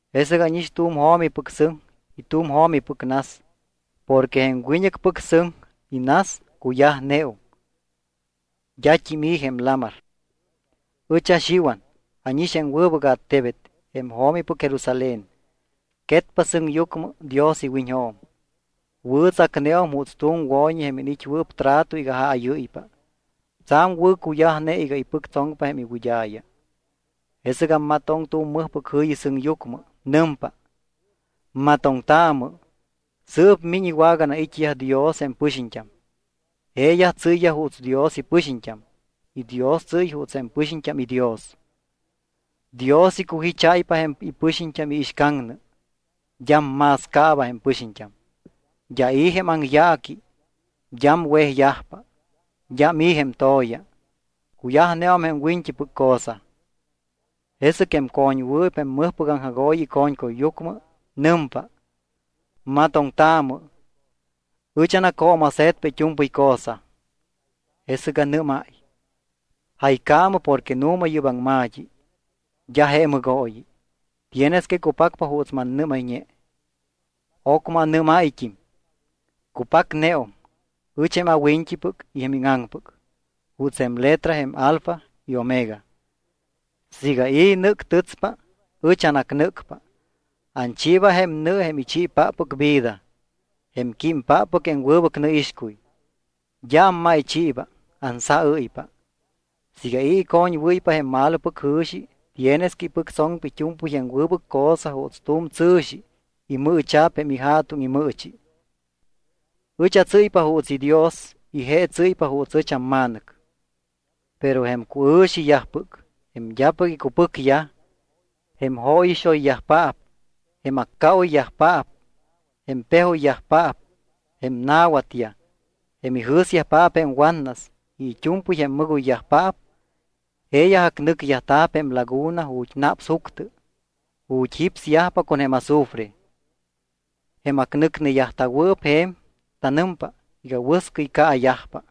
Jesɨc ánix tu̱m jo̱mipɨc sɨŋ y tu̱m jo̱mipɨc nas porque jém wiñɨcpɨc sɨŋ y nas cuyajneum. D́at́im i̱ jém lamar. Ɨch aXiwan ánix jém wɨbɨc attebet, jém jo̱mipɨc Jerusalén, quetpa sɨŋyucmɨ Dios iwiñjo̱m. Wɨ̱tsacneum juuts tu̱m wo̱ñi jém iniit́wɨɨp trato iga jáyɨ́ypa. Tsa̱m wɨ̱cuyajne iga ipɨctsoŋpa jém iwɨd́a̱ya. Jesɨc ammatoŋ tu̱m mɨjpɨc jɨ̱yi sɨŋyucmɨ. Nɨmpa: —¡Matoŋtaamɨ! Sɨɨp miñ iwaganai̱t́iyaj Dios jém pɨxiñt́am. Jeeyaj tsɨ́y juuts Dios ipɨxiñt́am y Dios tsɨ́y juuts jém pɨxiñt́am iDios. Dios icujicháypa jém ipɨxiñt́am iixcaŋnɨ. D́am más caaba jém pɨxiñt́am. D́a i̱ jém aŋyaaqui. D́am wejyajpa. D́am i̱ jém to̱ya. Cuyajneum jém wiñt́ipɨc cosa. Jesɨc jém co̱ñwɨɨp jém mɨjpɨc aŋjagooyi ico̱ñcuyyucmɨ nɨmpa: —¡Matoŋtaamɨ! Ɨch anacjo̱mase̱tpa it́u̱mpɨy cosa. Jesɨc anɨ́máy: —Jaycaamɨ porque nu̱ma yɨ́p anaŋma̱t́i, d́a je mɨgooyi. Tienes que cupacpa juuts mannɨ́mayñe. Ocmɨ anɨ́máyt́im: —Cupacneum. Ɨch jém awiñt́ipɨc y jém íŋaŋpɨc, juuts jém letra jém alfa y omega. Siiga i̱ nɨ́ctɨtspa, ɨch anacnɨ́cpa. Anchiiba jém nɨ jém ichiipáppɨc vida, jém químpáppɨc jém wɨbɨc nɨixcuy. D́a ammáychiiba, ansaɨ́ypa. Siiga i̱ icoñwɨ́ypa jém malopɨc jɨ̱xi tienes que ipɨctsoŋpa it́u̱mpɨy jém wɨbɨc cosa juuts tu̱m tsɨ̱xi imɨɨcha̱p jém ija̱tuŋ imɨɨchi. Ɨch atsɨ́ypa juuts iDios y je tsɨ́ypa juuts ɨch amma̱nɨc. Pero jém cuɨ̱xiyajpɨc, jém d́apɨc icupɨcyaj, jém jóyixoyyajpaap, jém accaoyyajpaap, jém pejoyyajpaap, jém na̱watyaj, jém ijɨ̱syajpaap jém watnas y it́u̱mpɨy jém mɨgoyyajpaap, jeeyaj acnɨcyajta̱p jém laguna ju̱t́ naps juctɨ, ju̱t́ jípsyajpa con jém azufre. Jém acnɨcneyajta̱wɨɨp je̱m tanɨmpa iga wɨscɨy caayajpa.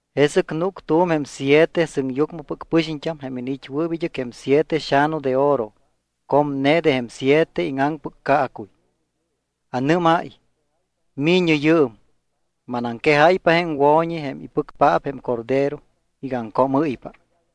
Jesɨc núc tu̱m jém siete sɨŋyucmɨpɨc pɨxiñt́am jém iniit́wɨɨp id́ɨc jém siete xa̱nu de oro comne de jém siete íŋaŋpɨc caacuy. Anɨ́máy: —¡Mi̱ñɨ yɨɨm! Manaŋquejáypa jém wo̱ñi, jém ipɨcpaap jém Cordero iga aŋcoomɨ́ypa.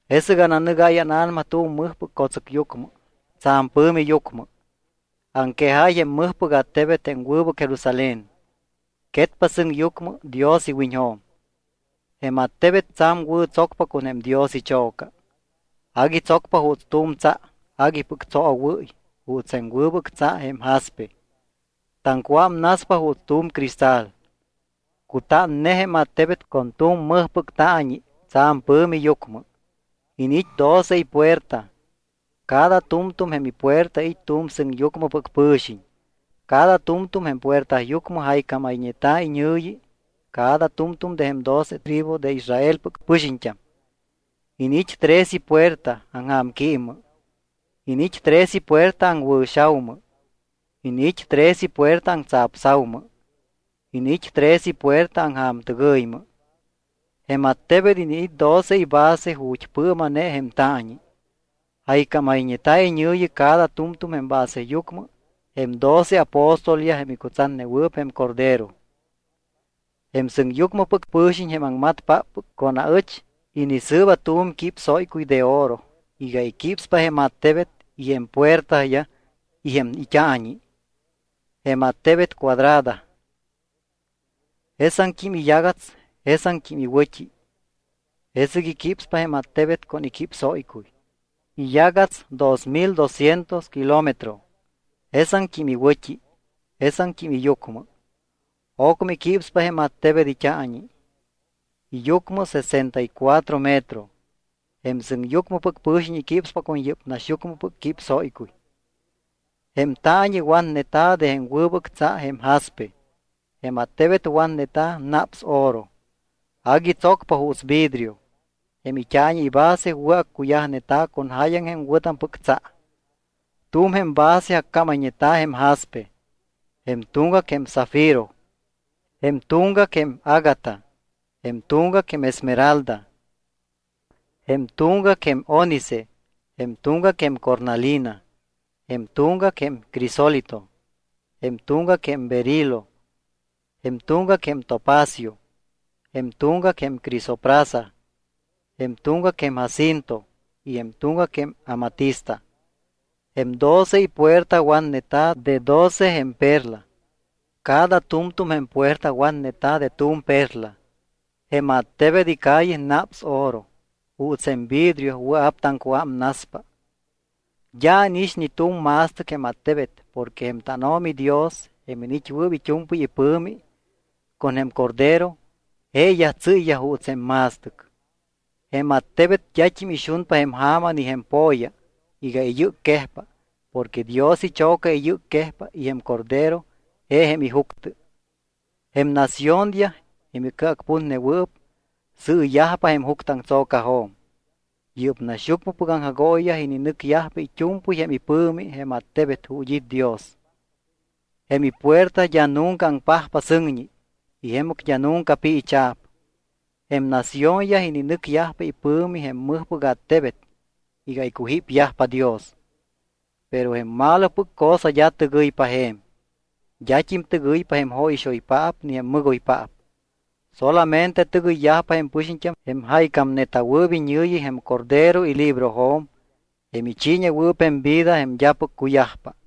Jesɨc ananɨgáy ána̱nama tu̱m mɨjpɨc co̱tsɨcyucmɨ tsa̱m pɨ̱mi yucmɨ. Aŋquejáy jém mɨjpɨc attebet jém wɨbɨc Jerusalén. Quetpa sɨŋyucmɨ Dios iwiñjo̱m. Jém attebet tsa̱m wɨ̱ tsocpa con jém Dios icho̱ca. Agui tsocpa juuts tu̱m tsa aguipɨc tsoowɨ́y juuts jém wɨbɨc tsa jém jaspe. Taŋcuámnaspa juuts tu̱m cristal. Cutánne jém attebet con tu̱m mɨjpɨc taañi tsa̱m pɨ̱mi yucmɨ. Iniit́ doce ipuerta. Cada tu̱mtu̱m jém ipuerta it́ tu̱m sɨŋyucmɨpɨc pɨ̱xiñ. Cada tu̱mtu̱m jém puertayucmɨ jaycámayñeta̱ iñɨ̱yi cada tu̱mtu̱m de jém doce tribu de jém Israelpɨc pɨxiñt́am. Iniit́ tres ipuerta aŋja̱mquímmɨ. Iniit́ tres ipuerta aŋwɨ̱xa̱umɨ. Iniit́ tres ipuerta aŋtsapsa̱umɨ. Iniit́ tres ipuerta aŋja̱mtɨgɨymɨ. Jém attebet iniit́ doce ibase ju̱t́ pɨɨma̱ne jém taañi. Jaycámayñeta̱ iñɨ̱yi cada tu̱mtu̱m jém baseyucmɨ jém doce apóstolyaj jém icutsatnewɨɨp jém Cordero. Jém sɨŋyucmɨpɨc pɨ̱xiñ jém aŋmatpáppɨc con aɨch inisɨɨba tu̱m quípsóycuy de oro iga iquípspa jém attebet y jém puertayaj y jém it́aañi. Jém attebet cuadrada. Jesaŋt́im iyagats jesaŋt́im iwɨ̱t́i. Jesɨc iquípspa jém attebet con iquípsóycuy. Iyagats dos mil dosciento kilómetro, jesaŋt́im iwɨ̱t́i, jesaŋt́im iyucmɨ. Ocmɨ iquípspa jém attebet it́aañi. Iyucmɨ sesenta y cuatro metro. Jém sɨŋyucmɨpɨc pɨ̱xiñ iquípspa con yɨ́p naxyucmɨpɨc quípsóycuy. Jém taañi watneta̱ de jém wɨbɨc tsa jém jaspe. Jém attebet watneta̱ naps oro. Agui tsocpa juuts vidrio. Jém it́aañi ibase wɨ̱accuyajneta̱ con jáyaŋ jém wɨ̱tampɨc tsa. Tu̱m jém base accámayñeta̱ jém jaspe. Jém tuŋgac jém zafiro, jém tuŋgac jém ágata, jém tuŋgac jém esmeralda, jém tuŋgac jém ónice, jém tuŋgac jém cornalina, jém tuŋgac jém crisólito, jém tuŋgac jém berilo, jém tuŋgac jém topacio, jém tuŋgac jém crisoprasa, jém tuŋgac jém jacinto y jém tuŋgac jém amatista. Jém doce ipuerta watneta̱ de doce jém perla. Cada tu̱mtu̱m jém puerta watneta̱ de tu̱m perla. Jém attebet icalle naps oro, juuts jém vidrio wɨa̱p taŋcuámnaspa. D́a ánix ni tu̱m ma̱stɨc jém attebet porque jém tánO̱mi Dios, jém iniit́wɨɨp it́u̱mpɨy ipɨ̱mi, con jém Cordero, jeeyaj tsɨ́yyaj juuts jém ma̱stɨc. Jém attebet d́at́im ixunpa jém ja̱ma ni jém po̱ya iga iyɨcquejpa porque Dios icho̱ca iyɨcquejpa y jém Cordero je jém ijuctɨ. Jém naciónyaj, jém icɨacputnewɨɨp, sɨɨyajpa jém juctɨaŋtso̱cajo̱m. Yɨ́p naxyucmɨpɨc aŋjagooyiyaj ininɨcyajpa it́u̱mpɨy jém ipɨ̱mi jém attebet ju̱t́ it́ Dios. Jém ipuerta d́a nunca aŋpajpa sɨŋñi, y jemɨc d́a nunca piicha̱p. Jém naciónyaj ininɨcyajpa ipɨ̱mi jém mɨjpɨc attebet iga icujípyajpa Dios. Pero jém malopɨc cosa d́a tɨgɨypa je̱m. D́at́im tɨgɨypa jém jóyixoypaap ni jém mɨgoypaap. Solamente tɨgɨyyajpa jém pɨxiñt́am jém jaycámneta̱wɨɨp iñɨ̱yi jém Cordero ilibrojo̱m jém ichiiñewɨɨp jém vida jém d́apɨc cuyajpa.